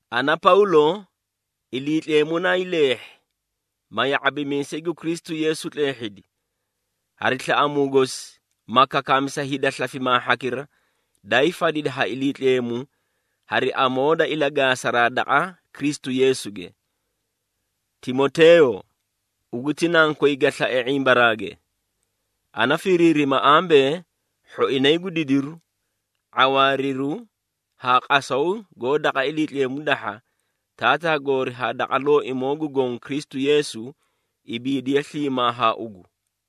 Ana Pawlo, Iliitleemu naayii leehhi, ma ya⁄abimiisay gu Kristu Yeesu tleehhidi, hari slaꞌamuu gosi, ma kakaami sa hida slafimaa hhakira, daayii fadidi ha Iliitleemu hari amoo da ilagaasaraa daqa Kristu Yeesuge. Timoteeyo, ugu ti nankoy ga slae ⁄imbaraage. Ana firiirima ambee, hhoinay gu didiru, ⁄awaariru haa qasaw goó daqa Iliitleemu dahha, Taataa goori haa daqa Looimoo gu Goõ Kristu Yeesu, ibiidiye sliimaa haa ugu.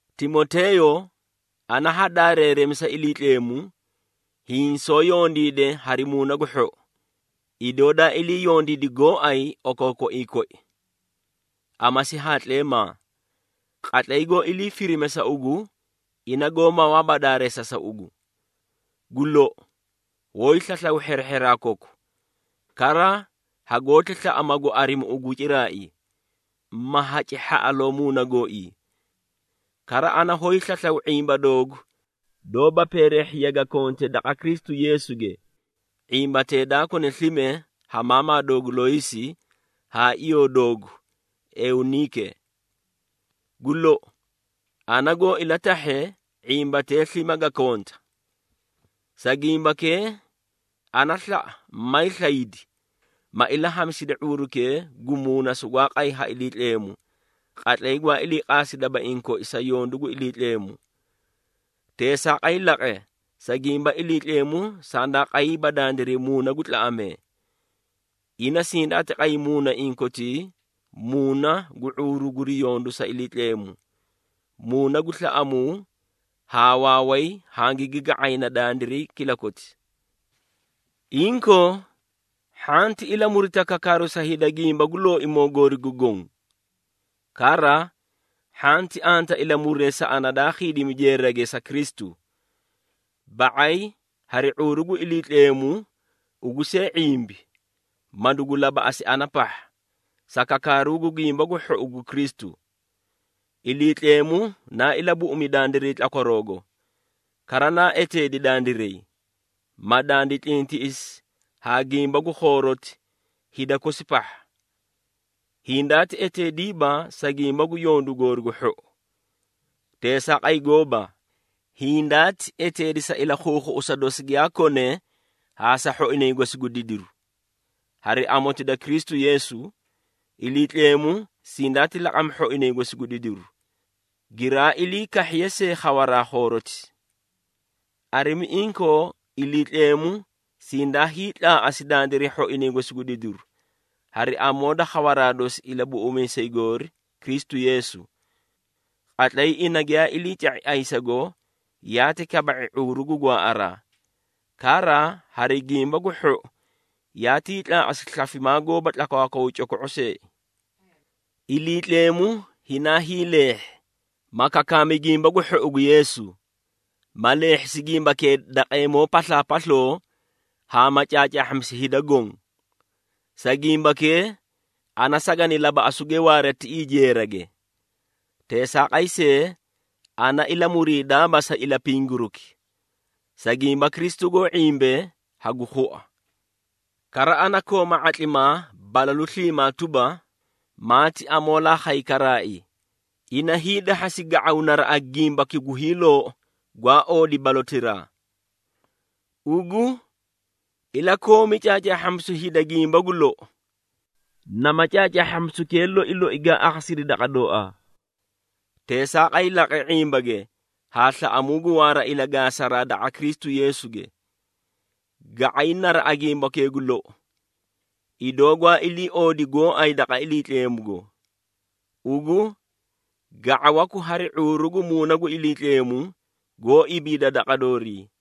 Timoteeyo, ana ha daareeremisa Iliitleemu, hiĩ soó yondiide hari muuna gu hhou, idoo daa ilii yondiidi gooay okookoiĩ koi. Amasi haa tleemaa, qatlay goó ilii firime sa ugu, ina goó mawaaba daareesa sa ugu. Gu lou, hoóyii slaslaw hherehheraa koku, kara hagoóti slaꞌa magu arimi ugu ciraai, ma haci hhaꞌaloo muuna gooii. Kara ana hoóyii slaslaw ⁄imba doogu doóba peereehhiya ga konte daqa Kristu Yeesuge, ⁄imbatee daa kone slime ha maamaa doogu Looysi haa iyoo doogu Euniike. Gu lou, ana goo ilatahhe, ⁄imbatee slime ga konta. Sa gimbakee, ana slaꞌa mayii slaydi, ma ilahamisidi ⁄uurukee gu muuna sugwaa qay ha Iliitleemu, qatlay gwaa ilii qaasi dabaiĩ koi sa yondu gu Iliitleemu. Teesaaqay laqe, sa gimba Iliitleemu sandaa qayiiba dandiray muuna gu tlaꞌamee. Ina sindaati qay muunaiĩ kotii muuna gu ⁄uuru guri yondu sa Iliitleemu, muuna gu slaꞌamuu haa waaway hangigi ga⁄ayna dandiray kilakoti. Inkoo hhanti ilamurita kakaaru sa hida gimba gu Looimoo goori gu goõ. Kara hhanti anta ilamuree sa ana daa khiidimi jeerage sa Kristu. Ba⁄ay hari ⁄uuru gu Iliitleemu ugu see ⁄imbi, ma dugu labaꞌasi ana pahha, sa kakaaru Gimba gu Hhou gu Kristu. Iliitleemu naa ilabuꞌumi dandiray tlakwaroogo, kara naa eteedi dandiray, ma dandi tlintiꞌisi haa gimba gu khooroti hida kosi pahha. Hindaati eteediiba, sa gimba gu yondu goori gu hhou. Teesaaqay gooba! Hindaati eteedi sa ilakhuukhuꞌusa dosi giyaa kone haa sa hhoinay gosi gu didiru. Hari amoti da Kristu Yeesu, Iliitleemu sindaati laqami hhoinay gosi gu didiru, giraa ilii kahhiye see khawaraa khooroti. Arimi inkoo, Iliitleemu sindaa hiitlaaꞌasi dandiray hhoinay gosi gu didiru, hari amoo da khawaraa dosi Ilabuꞌumiisay goori, Kristu Yeesu. Qatlay ina giyaa iliica⁄i ayisago, yaati kaba⁄i ⁄uuru gu gwaaꞌaraa, kara hari Gimba gu Hhou yaatii tlaaꞌasi slafimaa goóba tlakwaakwaw coko⁄o seei. Iliitleemu hinaa hiileehhi, ma kakaami Gimba gu Hhou gu Yeesu, ma leehhisi gimbakee daqeemoo paslaapasloo haa ma caacaahhamisi hida goõ. Sa gimbakee, ana sagani labaꞌasuge waara tiꞌii jeerage. Teesaaqay see, ana ilamuriidaaba sa ilapingiruki, sa gimba Kristu goó ⁄imbe hagu khua. Kara ana kooma ⁄atlimaa balalu sliimaa tuba, maati amoolaa khay karaai, ina hiidahhasi ga⁄aw naraꞌa gimbaki gu hiiloou, gwaa oodi balotiraa. Ugu ilakoomi caacaahhamisu hida gimba gu lou, nama caacaahhamisukee loi loi gaa akhasidi daqa dooaa. Teesaaqay laqe ⁄imbage haa slaꞌamuu gu waara ilagaasaraa daqa Kristu Yeesuge. Ga⁄ay naraꞌa gimbakee gu lou, idoo gwaa iliioodi gooay daqa Iliitleemugo. Ugu ga⁄awaku hari ⁄uuru gu Muuna gu Iliitleemu goó ibiida daqa doorii.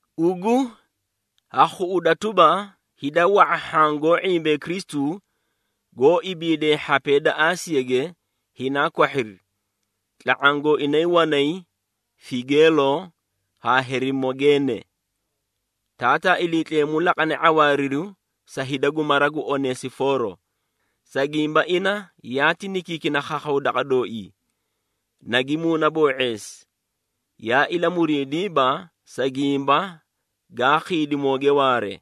Ugu ha khuꞌuda tuba, hida wa⁄a hhaã goó ⁄imbee Kristu, goó ibiidee hhapee da Aasiyage, hinaa kwahhiri, tla⁄aã gooinay wanay Figeelo haa Herimogeene. Taataa Iliitleemu laqane ⁄awaariru sa hida gu mara gu Onesifooro, sa gimba ina yaati nikiikina khakhawu daqa dooii, nagi muunaboo⁄eesi, yaa ilamuriidiiba, sa gimba gaa khiidimooge waare.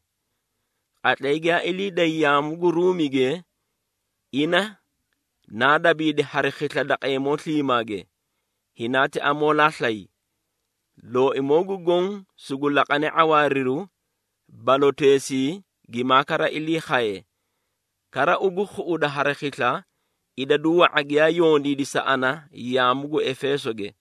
Qatlay giyaa ilii day yaamu gu Ruumige, ina naa dabiidi hari khisla daqeemoo sliimaage, hinaati amoolaa slay. Looimoo gu Goõ sugu laqane ⁄awaariru baloteesii gimaa kara ilii khaye. Kara ugu khuꞌuda hari khisla, idadu wa⁄a giyaa yondiidi sa ana yaamu gu Efeesoge.